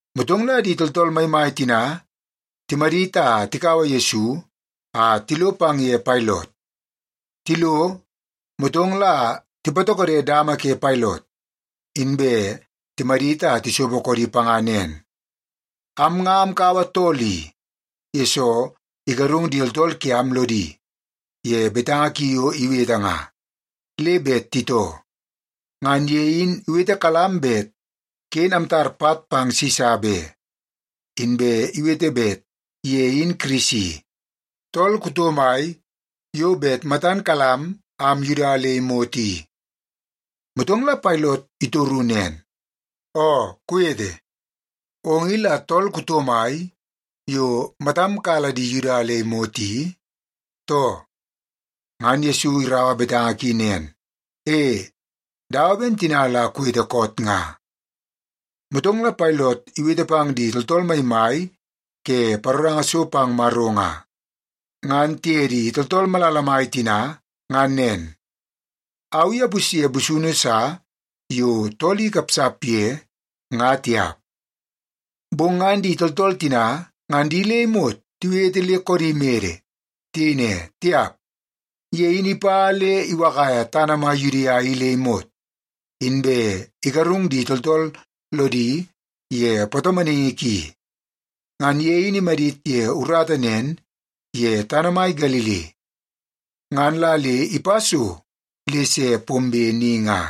Motong la di tooltool maimai tina timadit a tikaua Yesu a tilo pang ye Pailot. Tilo, motong la tipatokode dama ke Pailot, inbe timadit a tisopo koodi panga nen, “Am nga amkaua tool i, yesoo igarung di tooltool kiam lodi ye betanga ki yo iwete nga, le bet titoo. Ngan ye in iwetekalam bet ken amtar pat pang Sisa be, inbe iwete bet ye in Kirisi, tool kuto mai yo bet matan kalam am Yuda nga le imot i.” Motong la Pailot itoru nen, “Oo kuwete, ong i la tool kuto mai yo matam kala di Yuda le imot i, too?” Ngan Yesu iraua betanga ki nen, “E, dawa ben tina la kuwete koot nga.” Motong la Pailot iwete pang di tooltool maimai ke paroranga so pang Maro nga, ngan tiye di tooltool malala mai tina ngan nen, “Au i apusye busunu sa yo tool i ikapsap ye, nga tiap.” Bong ngan di tooltool tina ngan di le imot tiwete le koodi mede. Tiyei ne, “Tiap, ye in ipa le iwakaia tana mai Yudia i le imot, inbe igarung di tooltool lodi ye patomonaingi ki. Ngan ye in imadit ye urata nen ye tana mai Galili, ngan la le ipa so le se pombe ni nga.”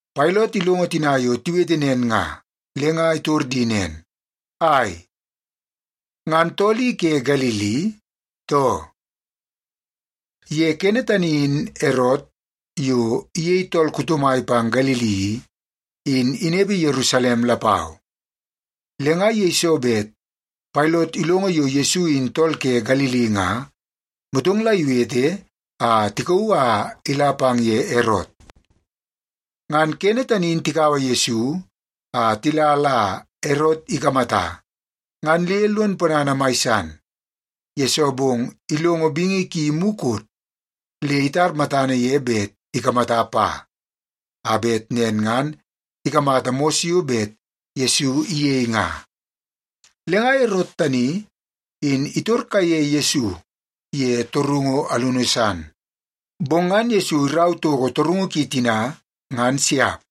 Pailot ilongo tina yo tiwete nen nga, le nga itor di nen, “Ai, ngan tool i ke Galili, too?” Ye kene tani in Erot, yo iyei tool kuto mai pang Galili i, in inepe Yerusalem lapau. Le nga yeiso bet Pailot ilongo yo Yesu in tool ke Galili nga, motong la iwete a tikauu a ila pang ye Erot. Ngan kene tani in tikaua Yesu a tila la Erot ikamata, ngan le lon ponana mai san, yesoo bong ilongo bingi ki mukot, le itar matana ye bet ikamata pa, a bet nen ngan ikamata mos yo bet Yesu iyei nga. Le nga Erot tani in itor kaiye Yesu ye torungu alunu san, bong ngan Yesu irau toko torungu ki tina, ngan siap.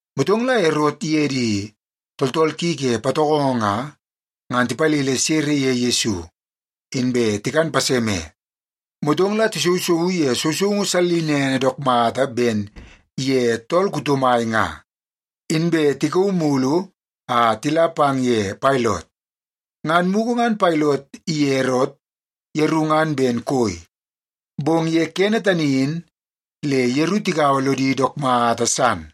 Motong la Erot iye di tooltool ki ke patokongo nga, ngan tipalele sere ye Yesu, inbe tikan paseme. Motong la tisousouu ye sousoungu sallinene dook mata ben ye tool kuto mai nga, inbe tikauu mulu a tila pang ye Pailot. Ngan mugu ngan Pailot iye Erot yeru ngan ben koi, bong ye kene tani in le yeru tigaua lodi dook mata san.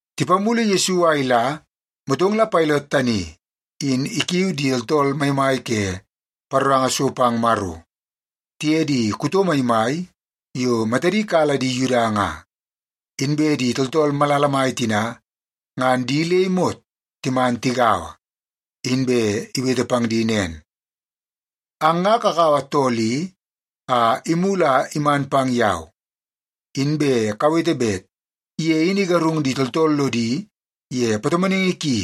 Tipamulu Yesu a ila, motong la Pailot tani in ikiui di tooltool maimai ke paroranga so pang Maro tiye di kuto maimai yo matadi kala di Yuda nga, inbe di tooltool malala mai tina ngan di le imot timan tigaua, inbe iwete pang di nen, “Ang nga kakaua tool i a imulu a iman pang yau, inbe kawete bet ye in igarung di tooltool lodi ye patomonaingi ki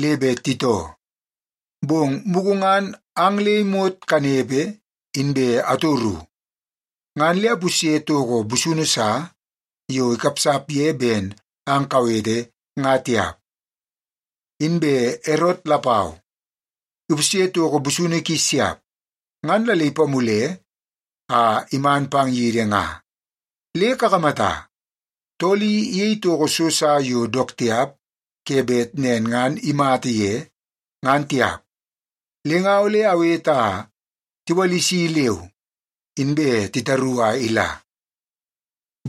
le bet titoo. Bong mugu ngan ang le imot kanepe, inbe atoru, ngan le apusye toko busunu sa yo ikapsap ye ben ang kawete nga tiap. Inbe Erot lapau ipusye toko busunu ki siap, ngan la le ipamule a iman pang yidi nga. Le kakamata, tool i iyei toko so sa yo dook tiap ke bet nen ngan imata ye, ngan tiap. Le nga ole awete a tiwalisi leu, inbe titaru a ila.”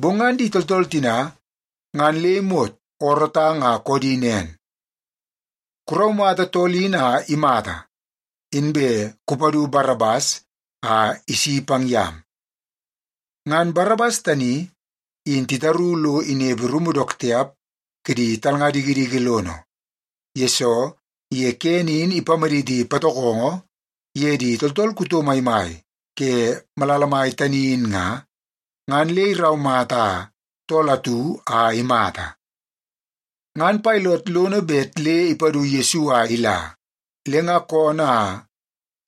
Bong ngan di tooltool tina ngan le imot oorootang a koodi nen, “Kuraumata tool in a imata! Inbe kupadu Barabas a isi pang yam.” (Ngan Barabas tani in titaru lo inepe rumu dook tiap kidi talnga dikidiki lono, yesoo ye kene in ipamaditi patokongo ye di tooltool kuto maimai ke malala mai tani in nga, ngan le iraumata tool atu a imata.) Ngan Pailot lono bet le ipadu Yesu a ila, le nga koonoo a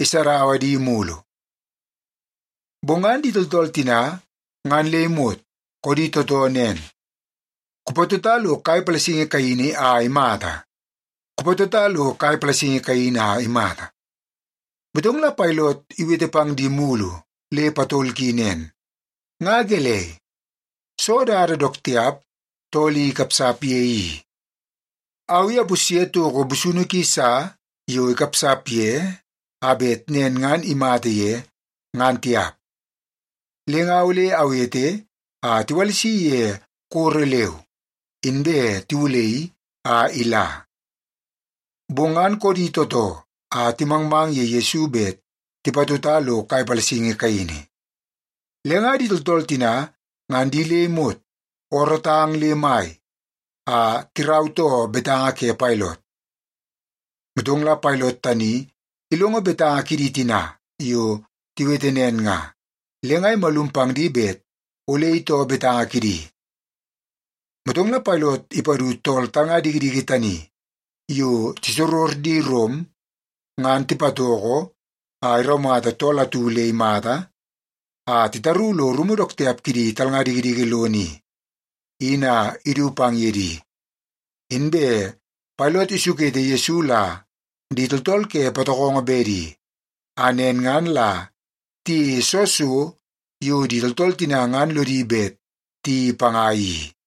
isadaua di mulu. Bong ngan di tooltool tina ngan le imot koodi tootoo nen, “Kupatota lo kai palasingi kaini a imata! Kupatota lo kai palasingi kaini a imata!” Motong la Pailot iwete pang di mulu le patol ki nen, “Nga gelei? Soo dada dook tiap tool i ikapsap ye i? Au i apusye toko busunu ki sa yo ikapsap ye, a bet nen ngan imata ye, ngan tiap. Le nga ole awete a tiwalisi ye koro leu, inbe tiwulaii a ila.” Bong ngan koodi tootoo a timangmang ye Yesu bet tipatota lo kai palasingi kaini. Le nga di tooltool tina ngan di le imot oorootang le mai a tirautoo betanga ke Pailot. Motong la Pailot tani ilongo betanga kidi tina yo tiwete nen nga, le nga imalum pang di bet ole itoo betanga kidi. Motong la Pailot ipadu tool talnga dikidiki tani yo tisoror di Rom ngan tipatoko a iraumata tool atu le imata a titaru lo rumu dook tiap kidi talnga dikidiki lono i, in a idu pang ye di. Inbe Pailot isukete Yesu la di tooltool ke patokongo bedi, a nen ngan la tiyeie soo so yo di tooltool tina ngan lodi bet tiyeii panga i.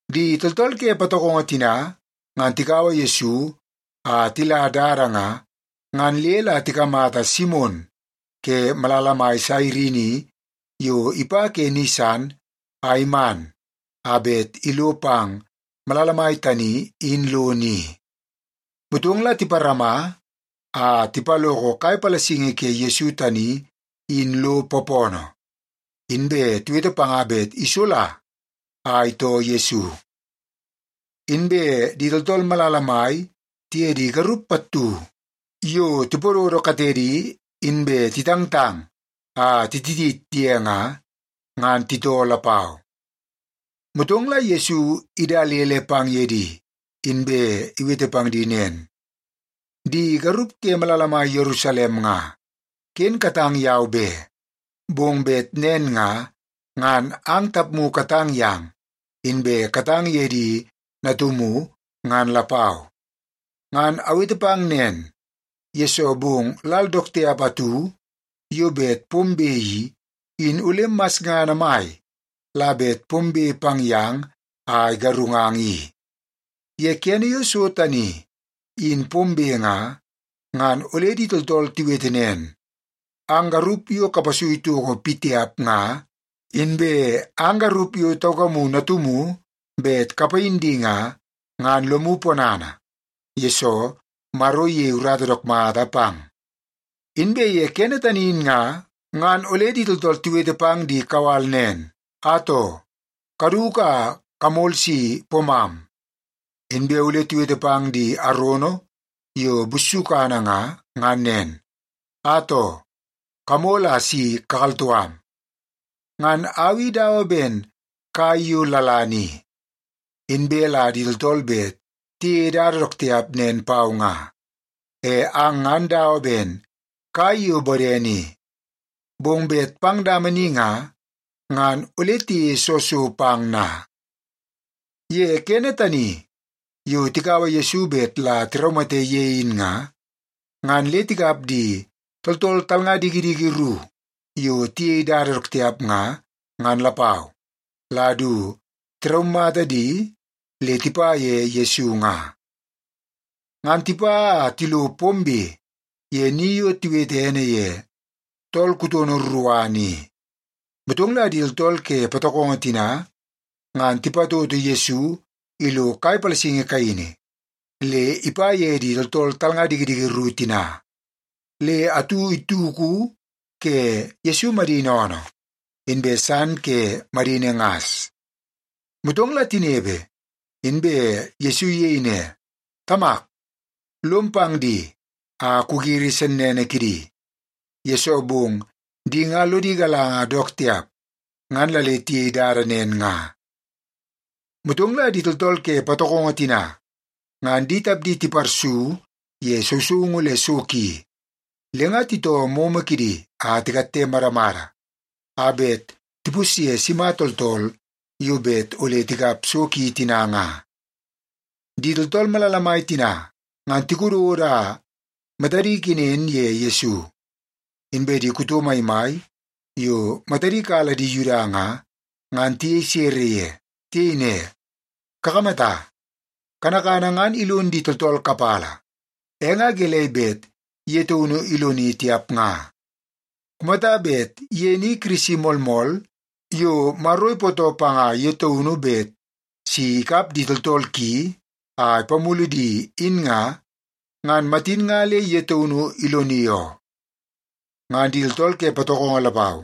Di tooltool ke patokongo tina ngan tikaua Yesu a tila dada nga, ngan le la tikamata Simon ke malala mai Sairini yo ipa ke ni san a iman a bet ilo pang malala mai tani in lono i. Motong la tiparama a tipaloko kai palasingi ke Yesu tani in lo poopoonoo, inbe tiwete panga bet isola a itoo Yesu. Inbe di tooltool malala mai tiye di garup pattu yo tipododo katedi inbe titangtang a tititit ye nga, ngan titoo lapau. Motong la Yesu idalele pang ye di, inbe iwete pang di nen, “Di garup ke malala mai Yerusalem nga, ken katang yau be. Bong bet nen nga, ngan ang tapmu katang yang inbe katang ye di natumu ngan lapau. Ngan awete pang nen, yesoo bong lal dook tiap atu yo bet pombe i, in ole masngana mai la bet pombe pang yang a igarungang i. Ye kene yo so tani in pombe nga, ngan ole di tooltool tiwete nen, ‘Ang garup yo kapasui toko pitiap nga, inbe ang garup yo taukamu natumu bet kapayin di nga, ngan lomu ponana, yesoo Maro iyei urata dook mata pang.’ Inbe ye kene tani in nga, ngan ole di tooltool tiwete pang di kawal nen, ‘Atoo, kaduku a kamol si poomam!’ Inbe ole tiwete pang di arono yo bussukana nga, ngan nen, ‘Atoo, kamol a si kakaltoo am!’ Ngan au i dawa ben kai yo lalana i, inbe la di tooltool bet tiyeie dada dook tiap nen pau nga. E ang ngan dawa ben kai yo bodene i, bong bet pang dama ni nga, ngan ole tiyeie soo so pang na?” Ye kene tani yo tikaua Yesu bet la tiraumate ye in nga, ngan le tikap di tooltool talnga dikidiki ru yo tiyei dada dook tiap nga, ngan lapau, la du tiraumata di le tipa ye Yesu nga. Ngan tipa a tilo pombe ye ni yo tiwete ene ye Tool Kutono Ruruana i, motong la di tooltool ke patokongo tina nga tipatoto Yesu ilo kai palasingi kaini le ipa ye di tooltool talnga dikidiki ru tina. Le atu ituku ke Yesu madini oonoo, inbe san ke madini ngas. Motong la tinepe, inbe Yesu iyei ne, “Tamak, lom pang di a kugiri sennene kidi, yesoo bong di nga lodi galanga dook tiap ngan la le tiyei dada nen nga.” Motong la di tooltool ke patokongo tina ngan di tapdi tiparsu ye sousoungu le so ki, le nga titoo moonoo kidi a tikatte madamada a bet tipusye sima tooltool yo bet ole tikap so ki tina nga. Di tooltool malala mai tina ngan tikododo a matadi kenen ye Yesu, inbe di kuto maimai yo matadi kala di Yuda nga, ngan tiyei sere ye. Tiyei ne, “Kakamata, kanakana ngan ilon di tooltool kapala, e nga gelei bet ye taunu iloni tiap nga? Kumata bet ye ni Kirisi moolmool yo Maro ipootoo panga ye taunu bet si ikap di tooltool ki a ipamulu di in nga, ngan matin nga le ye taunu iloni oo.” Ngan di tooltool ke patokongo lapau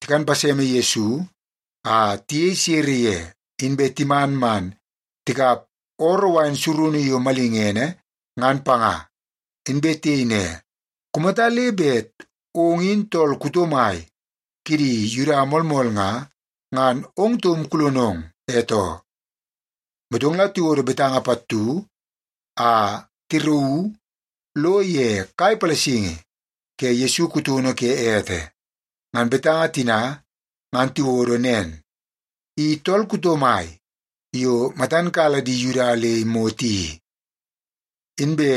tikan paseme Yesu a tiyei sere ye, inbe timan man tikap ooroo wain surunu yo malingene ngan panga. Inbe tiyei ne, “Kumata le bet ong in tool kuto mai kidi Yuda moolmool nga, ngan ong taum kulonong e too.” Motong la tiwodo betanga pattu a tirauu lo ye kai palasingi ke Yesu kutono ke ete. Ngan betanga tina ngan tiwodo nen: I Tool Kuto Mai Yo Matan Kala Di Yuda Le Imot I. Inbe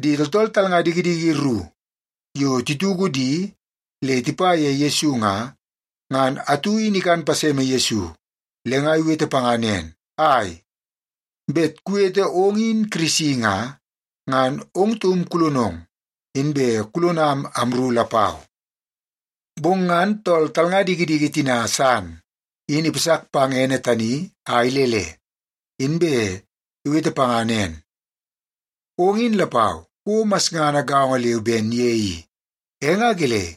di tooltool talnga dikidiki ru yo tituku di le tipa ye Yesu nga, ngan atu in ikan paseme Yesu, le nga iwete panga nen, “Ai, bet kuwete ong in Kirisi nga, ngan ong taum kulonong, inbe kulonam amru lapau!” Bong ngan tool talnga dikidiki tina san in ipasak pang ene tani a ilele, inbe iwete panga nen, “Ong in lapau kouo masngana gaongo leu ben ye i, e nga gelei,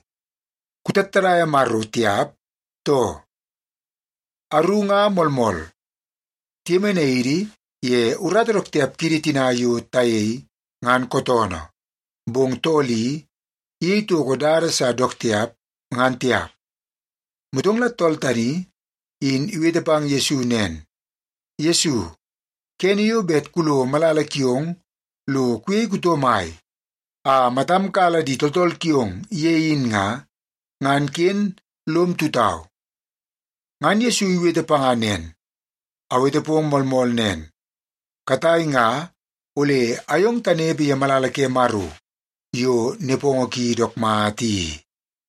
kutattadaia Maro tiap, too? Aru nga moolmool, tiyemenai idi ye urata dook tiap kidi tina yo tayei, ngan kootoonoo. Bong tool i iyei toko dada sa dook tiap, ngan tiap.” Motong la tool tani in iwete pang Yesu nen, “Yesu, kene yo bet kulo malala kiong lo kuyei kuto mai a matam kala di tooltool kiong ye in nga, ngan ken lom tutau.” Ngan Yesu iwete panga nen, “Awete pong moolmool nen, katai nga ole ayong tanepe ye malala ke Maro yo nepongo ki dook mata i.”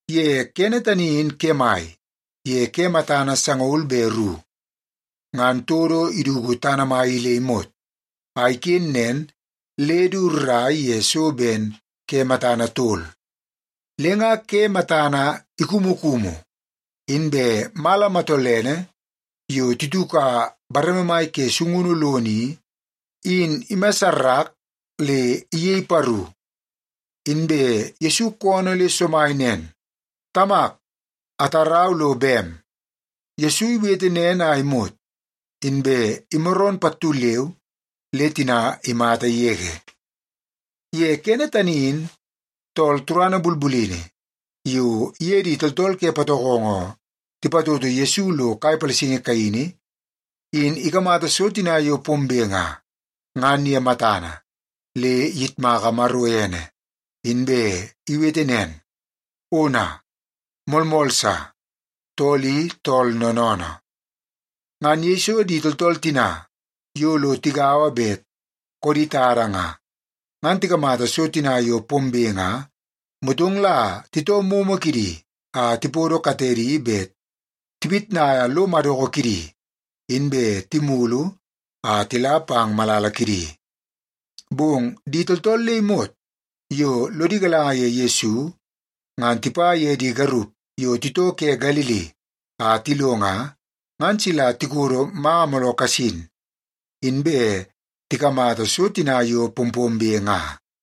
Ye kene tani in kemai ye ke matana sangaul be ru, ngan todo iduku tana mai i le imot, a iken nen le du rrai ye so ben ke matana tol. Le nga ke matan ikumukumu, inbe mala matolene yo tituka bareme mai ke sungunu lono i, in imassarak le iyei paru. Inbe Yesu koonoo le somai nen, “Tamak, atarau lo bem.” Yesu iwete nen a imot, inbe imaroon pattu leu le tina imata yege. Ye kene tani in tool turana bulbulini yo iye di tooltool ke patokongo tipatoto Yesu lo kai palasingi kaini, in ikamata so tina yo pombe nga, ngan ye matana, le iyitmaka Maro ene, inbe iwete nen, “Ona, moolmool sa, tool i tool noonoonoo.” Ngan yeiso di tooltool tina yo lo tigaua bet koodi tada nga, ngan tikamata so tina yo pombe nga, motong la titoo momo kidi a tipodo katedi bet tipitnaia lo madoko kidi, inbe timulu a tila pang malala kidi. Bong di tooltool le imot yo lodi galanga ye Yesu, ngan tipa ye di garup yo titoo ke Galili a tilo nga, ngan sila tikodo manga mooloo kasin, inbe tikamata so tina yo pompombe nga.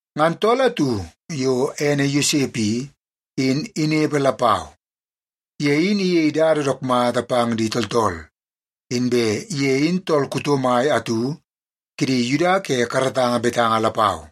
Ngan tool atu yo ene Yosep i, in inepe lapau. Ye in iyei dada dook mata pang di tooltool, inbe ye in tool kuto mai atu kidi Yuda ke karatanga betanga lapau.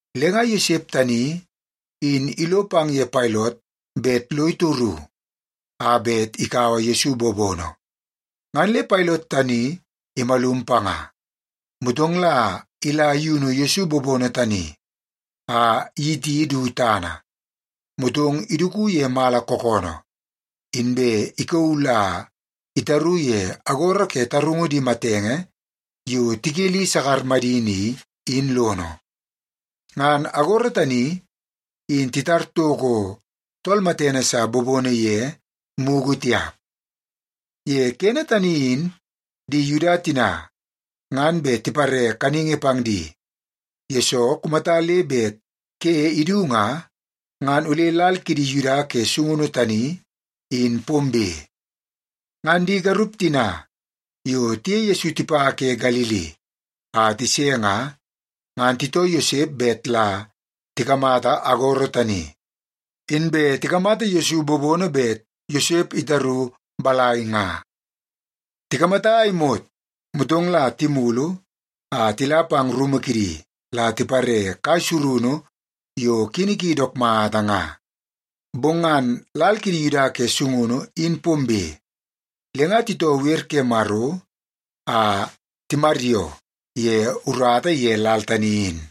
Le nga Yosep tani in ilo pang ye Pailot bet lo itoru a bet ikaua Yesu bobono, ngan le Pailot tani imalum panga. Motong la ila iyunu Yesu bobono tani a iyiti du tana, motong iduku ye mala kookoonoo, inbe ikauu la itaru ye agoro ke tarungu di matenge yo tikeli sakar madini i, in lono. Ngan agoro tani in titar toko tool matene sa bobono ye mugu tiap. Ye kene tani in di Yuda tina ngan bet tipare kaningi pang di, yesoo kumata le bet ke idu nga, ngan ole lal kidi Yuda ke sungunu tani in pombe. Ngan di garup tina yo tiye Yesu tipa ke Galili a tise nga, ngan titoo Yosep bet la tikamata agoro tani, inbe tikamata Yesu bobono bet Yosep itaru balai nga. Tikamata a imot, motong la timulu a tila pang rumu kidi la tipare kai surunu yo kini ki dook mata nga. Bong ngan lal kidi Yuda ke sungunu in pombe, le nga titoo wer ke Maro a timaryoo ye urata ye lal tani in.